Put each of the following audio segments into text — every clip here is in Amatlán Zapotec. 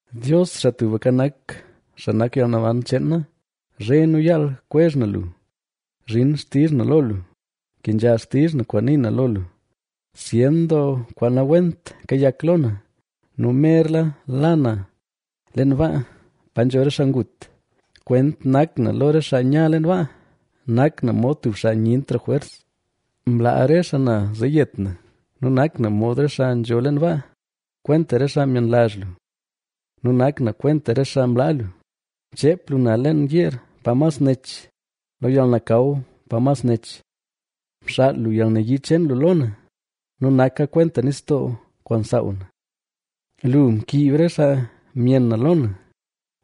Dios, Xaa Tubka Nak, xaa nak yalnaban cheen na, zhe nu yaal kwezh na lu. ¡Zhin xtizh na lo lu, kenzha xtizh na kwaan nii na lo lu! Zyen doo kwaan nawent kayak lo na nu merla la na leen baa, pa nzho re xaa ngut. Kwent nak na lo re xaa nya leen baa, nak na mod tub xaa nyentra jwers, mlaa re xaa na zee yet na nu nak na mod re xaa nzho leen baa, kwenta re xaa myenlazh lu nu nak na kwenta re xaa mlaa lu. Mcheep lu na leen yeer pa mas nech, lo yalnakaw pa mas nech. Mxaal lu yalnayii cheen lu lo na ¡nu naka kwenta nistoo, kwaan msaaw na! Lu mkiib re xaa myenn na lo na;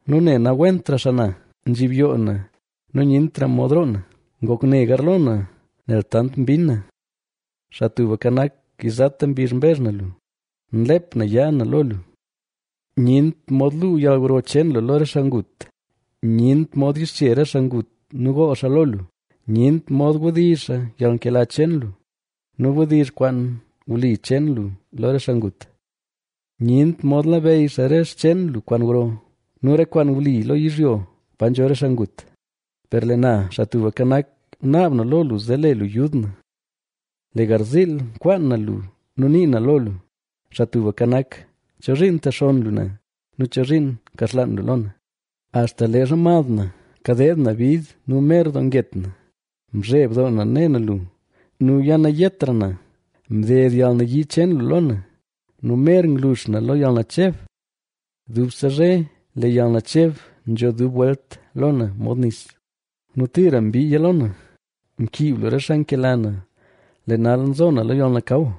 nu ne nawentra xaa na; nzhibyoo na nu nyentra mod roo na. Ngok ne garlo na nel tant mbinn na. Xaa Tubka Nak, yizata mbizh mbezh na lu; nlep na yaa na lo lu. ¡Nyent mod luu yalgro cheen lu lo re xaa ngut! ¡Nyent mod yixche re xaa ngut nu gool xaa lo lu! ¡Nyent mod wdizh xaa yalnkela cheen lu nu wdizh xaa kwaan wli cheen lu lo re xaa ngut! ¡Nyent mod labeyy xaa re xcheen lu kwaan gro nu re kwaan wli lo yizhyo pa nzho re xaa ngut! Per lee na, Xaa Tubka Nak, naab na lo lu zee le lu yud na; lee garziil nkwaan na lu nu nii na lo lu. Xaa Tubka Nak, ¿Chozhiin ntexonn lu na? ¿Nu chozhiin nkaxlaan lu lo na? Axta leezha mad na kadeed na bid nu mer doo nget na, mzheb doo na ne na lu, nu yanayetra na. Mded yalnayii cheen lu lo na, nu mer nglux na lo yalnacheb. Dubse zhe lee yalnacheb nzho dub welt lo na, mod nis; nu tira mbiiya lo na. Mkiib lu re xaa nkela na, lee nal nzo na lo yalnakaw.